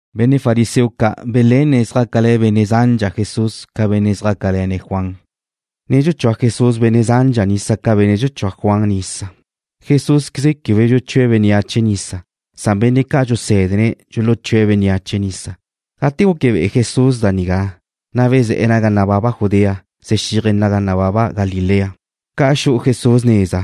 Benne' fariseo ca' belenne̱' zjácale̱ benne' zandxa Jesús ca benne' zjácale̱ne̱' Juan, na' dxuchúa Jesús benne' zandxa nisa ca benne' dxuchúa Juan nisa. Quebe dxuchúaqueze Jesús bénneache nisa. Benne' ca' dxusé̱dene̱' dxuluchúe̱' bénneache nisa. Gate guque be'e Jesús da nigá, na' bezé̱'e̱ naga nababa Judea, xexíaje̱' naga nababa Galilea. Ca xu'u Jesús neza,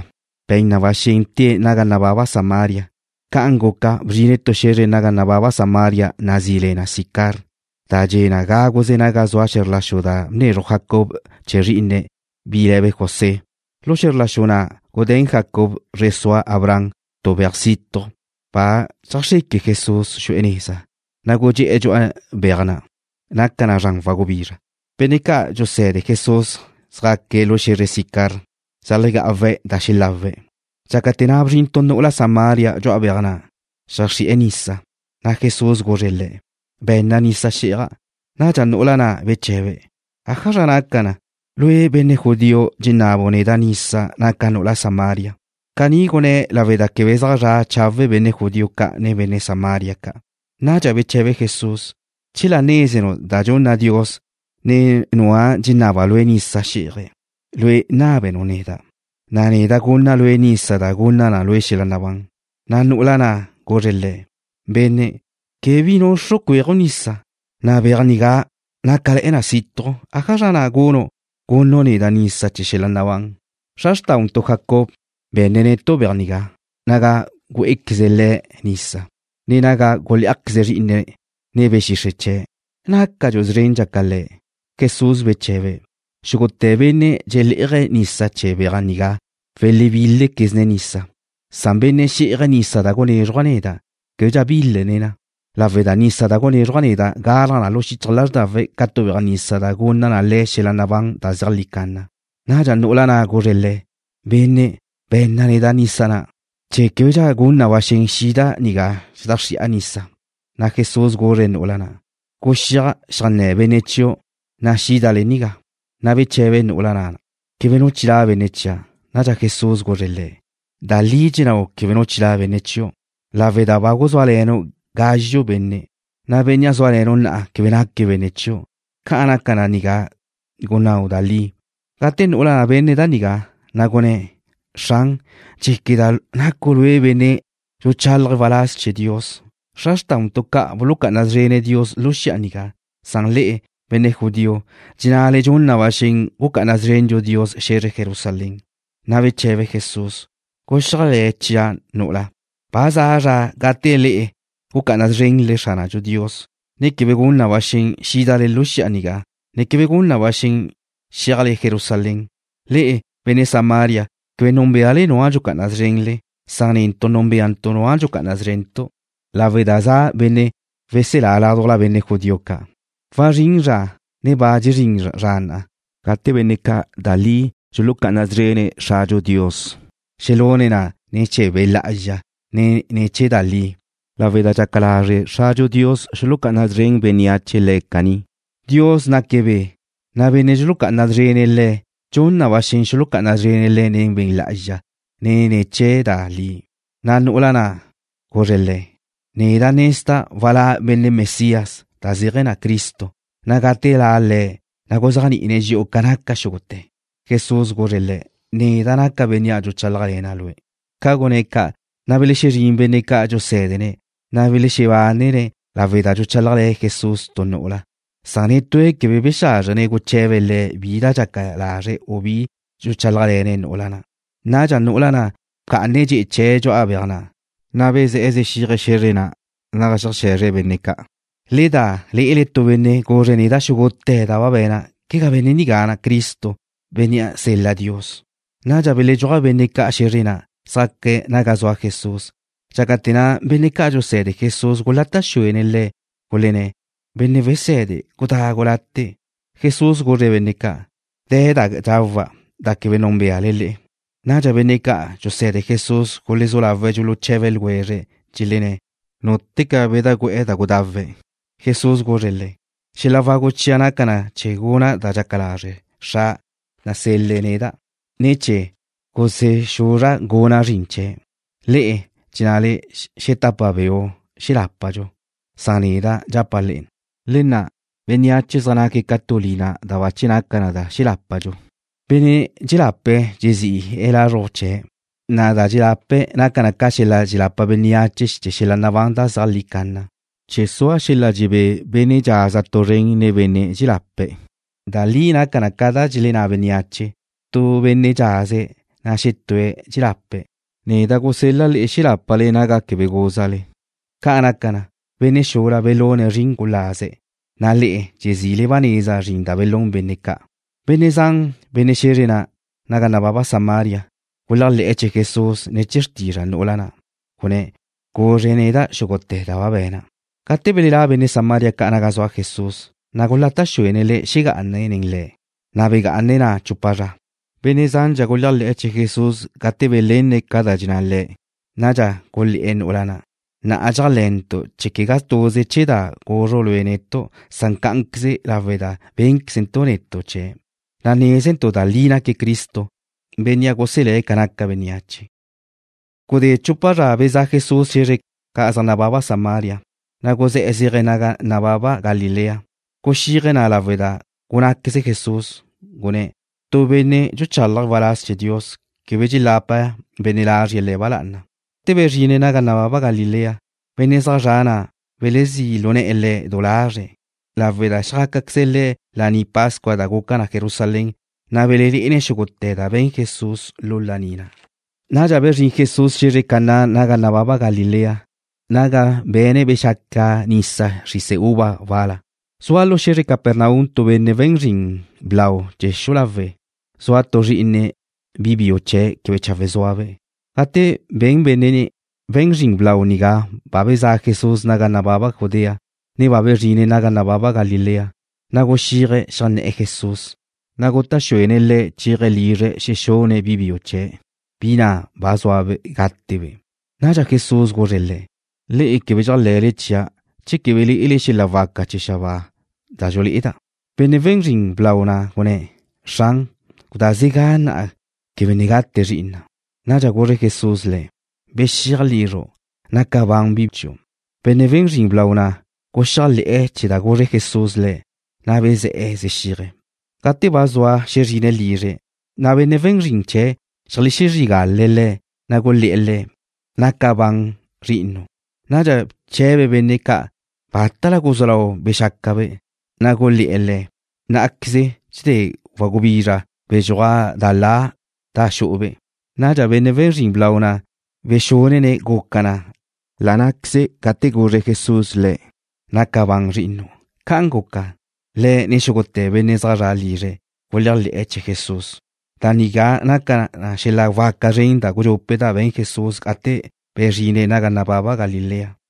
be̱n na ba xen tée̱' naga nababa Samaria. Ca'an guca, bzrine̱' tu xe̱zre naga nababa Samaria nazí le na Sicar, da dxe' gáguze naga zua xe̱zr la xu na' bnezruj Jacob chee̱ zrí'ine̱', bi le̱be' José. Lu xe̱zr la xu na' gudé̱n Jacob, zre sua Abraham, tu beaj situj. Ba dxeajxreque Jesús xu'e̱ neza, na' gudxé'e̱ dxu'a beaj na'. Naca na zran wagubizra. Benne' ca' dxuse̱de Jesús xjaque̱' lu xe̱zre Sicar, xeajlegá'awe̱' da xelawe̱'. Dxácate̱ na' bzrin tu nu'ula Samaria dxu'a beaj na' zeajxri'e̱ nisa, na' Jesús guzre̱' le̱': ―Be̱nna nisa xí'aja'. Nadxa nu'ula na' beche̱be̱': ―¿Ájazra naca, lue', benne' judío, dxenabu' neda' nisa, naca' nu'ula Samaria? Caní gunné̱' lawe' da quebe zaj zra' chawe' benne' judío ca' nen benne' Samaria ca'. Nadxa beche̱be Jesús: ―Chela nézenu' da dxunna Dios, ne nua' dxenabe̱' lue' nisa xí'aje̱', lue' nábenu' neda', na' neda' gunna' lue' nisa da gunna na lue' xel-la' nabán. Na' nu'ula na' guzre̱' Le̱': ―Benne', quebe bi nuxru' cuéaju' nisa, na' beaj nigá nácale̱'e̱ na situj. ¿Ájazra na' gunu' gunnu' neda' nisa chee̱ xel-la' nabán? Xra xrtáuntu', Jacob, be̱nne̱' netu' beaj nigá, naga güé'equeze le̱' nisa, ne naga gulé'ajqueze zrí'ine̱', ne be̱ xixre' chee̱'. ¿Nácadxu' szrendxa ca le̱'? Jesús beche̱be̱': ―Xúgute̱ benne' dxelé'aje̱' nisa chee̱ beaj nigá welexebílequezne̱' nisa. Nu benne' xí'aje̱' nisa da gunézruja' neda', québedxa bílene̱' na, lawe' da nisa na' dxunézruja' neda' galaj na lu xichaj lázrdawe̱' ca tu beaj nisa da gunna na le̱' xel-la' nabán da zeajlí canna. Nadxa nu'ula na' guzre̱' Le̱': ―Benne', be̱nna neda' nisa na', chee̱ québedxa gun na ba xen xida' nigá xedajxrí'a nisa. Na' Jesús guzre̱' nu'ula na': ―Guxíaj xeajnné̱ benne' chiu', na' xídale nigá. Na' beche̱be nu'ula na': ―Quebe nu chilá' benne' chia'. Nadxa Jesús guzre̱' le̱': ―Da li dxennáu' quebe nu chilá' benne' chiu', lawe' da ba guzúale̱nu' gazxu' benne', na' bénnea' zúale̱nu' na'a quebe naque̱' benne' chiu'. Ca naca da nigá gunnáu' da li. Gate nu'ula' benne̱' da nigá, na' gunné̱': ―Xran, dxéqueda' nacu' lue' benne' dxuchalaje̱' waláz chee̱ Dios. Xra xrtáuntu' ca' bulucá'ana szrene̱' Dios lu xi'a nigá, na' le'e, benne' judío, dxennale dxun na ba xen gucá'ana szrendxu Dios xe̱zre Jerusalén. Na' beche̱be Jesús: ―Guxéajle̱ chia', nu'ula. Ba za zra gate le'e gucá'ana szrenle Xradxu Dios, ne quebe gun na ba xen xídale lu xi'a nigá, ne quebe gun na ba xen chéajle Jerusalén. Le'e, benne' Samaria, quebe núnbeale nua' dxucá'ana szrenle. Netu' núnbeantu' Nua' dxucá'ana szrentu', lawe' da za' benne' weselá ládujla benne' judío ca'. Wazrín zra, ne ba dxezrín zra na', gate benne' ca' da li dxulucá'ana szrene̱' Xradxu Dios, xelune̱' na ne̱ chee̱ Be' Lá'azxa, ne ne̱ chee̱ da li, lawe' da dxaca lazre' Xradxu Dios xulucá'ana szren bénneache Le̱' caní. Dios naque̱' Be', na' benne' dxulucá'ana szrene̱' Le̱', dxun na ba xen xulucá'ana szrene̱' Le̱' ne̱ chee̱ Be' Lá'azxa, ne ne̱ chee̱ da li. Na' nu'ula na' guzre̱' Le̱': ―Neda' nezda' walá' benne' Mesías (da zéaje̱ na Cristo), na' gate la' Le̱', na' guzéajni'ine̱' dxi'u ca naca xúgute̱. Jesús guzre̱' le̱': ―Neda' naca' Bénnea', dxuchálajle̱na' lue'. Ca gunné̱' ca', na' belexezrín benne' ca' dxuse̱dene̱', na' belexebánene̱' lawe' da dxuchálajle̱ Jesús tu nu'ula Netúe̱' quebe bexázrjene̱' guche̱be̱' Le̱' bi da dxaca lazre̱', u bizra chee̱n dxuchálajle̱ne̱' nu'ula na'. Nadxa nu'ula na' bca'ane̱' dxe'e chee̱' dxu'a beaj na', na' bezé̱'e̱ zexíaje̱' xe̱zre na' naga xeaje̱zre̱' benne' ca': ―Le da lé'ele tu benne' guzre̱' neda' xúgute̱ da ba be̱na'. ¿Quegá benne' nigá Cristo, Bénnea' sel-la Dios? Nadxa beledxúaj benne' ca' xe̱zre na', zjaque̱' naga zua Jesús. Dxácate̱ na', benne' ca' dxuse̱de Jesús gulata' xuene̱' Le̱', gulenné̱': ―Benne' Wese̱de, gudagu late'. Jesús guzre̱' benne' ca': ―De̱ da dxawa', da quebe núnbeale le'e. Nadxa benne' ca' dxuse̱de Jesús gulezú lawe̱' dxuluche̱be ljwezre̱', dxelenné̱': ―¿Núteca bedajgú'e̱ da gudawe̱'? Jesús guzre̱' le̱': ―Xela wagu chia' naca na chee̱ guna' da dxaca lazre' Xra', Bénnea' nasel-le̱' neda', ne chee̱ gusexuzra' guna' zrin chee̱'. Le'e dxennale: “Xetapa beu' xelápadxu.” Neda' dxapa' le'e, le nna' bénneache zaj naque̱' ca tu lina, da bache naca na xelápadxu. Benne' dxelape̱' dxezi'e̱ lazruj chee̱', na' da dxelape̱' naca na chee̱ xelapa bénneache xel-la' nabán da zeajlí canna, chee̱ sua xel-la' dxebé benne' dxaza tu zren nen benne' ca' dxelelape̱'. Da li naca ca da dxelenná bénneache: Tu benne' dxaze̱', na' xetúe̱' dxelape̱'. Neda' gusel-la' le'e xelápale naga quebe gúzale. Ca' naca na, benne' xula belune̱' zrin gulaze̱', na' le'e dxezile ba neza zrin da belún benne' ca'. Benne' zan, benne' xe̱zre na' naga nababa Samaria, guléajle̱'e̱ chee̱ Jesús ne̱ chee̱ xrtizra' nu'ula na', gunné̱': “Guzre̱' neda' xúgute̱ da ba be̱na'.” Gate belelá' benne' Samaria ca' naga zua Jesús, na' gulata' xuene̱' Le̱' xegá'ane̱' nen le̱', na' begá'ane̱' na' chupa zra. Benne' zandxa guléajle̱'e̱ chee̱ Jesús gate belenne̱' ca da dxenná Le̱'. Nadxa gulé̱'e̱ nu'ula na': ―Na'a dxéajle̱ntu' chee̱' quegá tuze ne̱ chee̱ da guzru' lue' netu', na' cá'anqueze lawe' da bénquezentu' netu' chee̱', na' nézentu' da li naque̱' Cristo, Bénnea' guselé̱' ca naca bénneache. Gudé chupa zra bezá' Jesús xe̱zre ca' zaj nababa Samaria, na' guzé̱'e̱ zéaje̱' naga nababa Galilea. Guxíaje̱' na' lawe' da gunnáqueze Jesús, gunné̱': “Tu benne' dxuchalaje̱' waláz chee̱ Dios, quebe dxelapa benne' lazrie̱' le̱' ba lá'ana.” Gate bezrine̱' naga nababa Galilea, benne' zaj zre̱'e̱ na' belezí' lu ne̱'e̱ Le̱' du lazre̱', lawe' da xjácaqueze le̱' Laní Pascua da guca na Jerusalén, na' belelé'ene̱' xúgute̱ da be̱n Jesús lu laní na'. Nadxa bezrín Jesús xe̱zre Caná naga nababa Galilea naga be̱ne̱' bexaca nisa xrise uva wal-la. Zua lu xe̱zre Capernaum tu benne' we̱n zrin blau chee̱ xu'u lawe', zua tu zrí'ine̱' bi biu quebe chawe' zúabe'. Gate ben benne' we̱n zrin blau nigá ba bezá' Jesús naga nababa Judea, ne ba bezrine̱' naga nababa Galilea, na' guxíaje̱' xeajnné̱'e̱ Jesús, na' gutá' xuene̱' Le̱' chéaje̱' lizre̱' xexune̱' bi biu chee̱', bi na' ba zua gátebe'. Nadxa Jesús guzre̱' le̱': ―Le'e quebe chéajle̱le chia' che quebe lé'ele xel-la' waca chee̱ xabáa da dxulé'eda'. Benne' we̱n zrin blau na' gunné̱': ―Xran, gudázega na'a quebe ne gate zri'ina'. Nadxa guzre Jesús le̱': ―Bexíaj lizru'. Naca ban bi chiu'. Benne' we̱n zrin blau na' guxéajle̱'e̱ chee̱ da guzre Jesús lé̱', na' bezé̱'e̱ zexíaje̱'. Gate ba zua xezrine̱' lizre̱', na' benne' we̱n zrin chee̱' xeajlexezrígale̱' le̱', na' gulé̱'e̱ le̱': ―Naca ban zri'inu'. Nadxa bche̱be̱' benne' ca' bátala guzú lau bexácabe', na' gulé̱'e̱ le̱': ―Ná'aqueze dxedé wagubizra bedxúaj da la da xu'ube'. Nadxa benne' we̱n zrin blau na' bexúnene̱' guca na la' ná'queze gate guzre Jesús le̱': “Naca ban zri'inu'.” Ca'an guca, le̱', ne xúgute̱ benne' zaj zra' lizre̱' guléajle̱'e̱ chee̱ Jesús. Da nigá naca na xel-la' waca zren da gudxupe' da be̱n Jesús gate bezrine̱' naga nababa Galilea.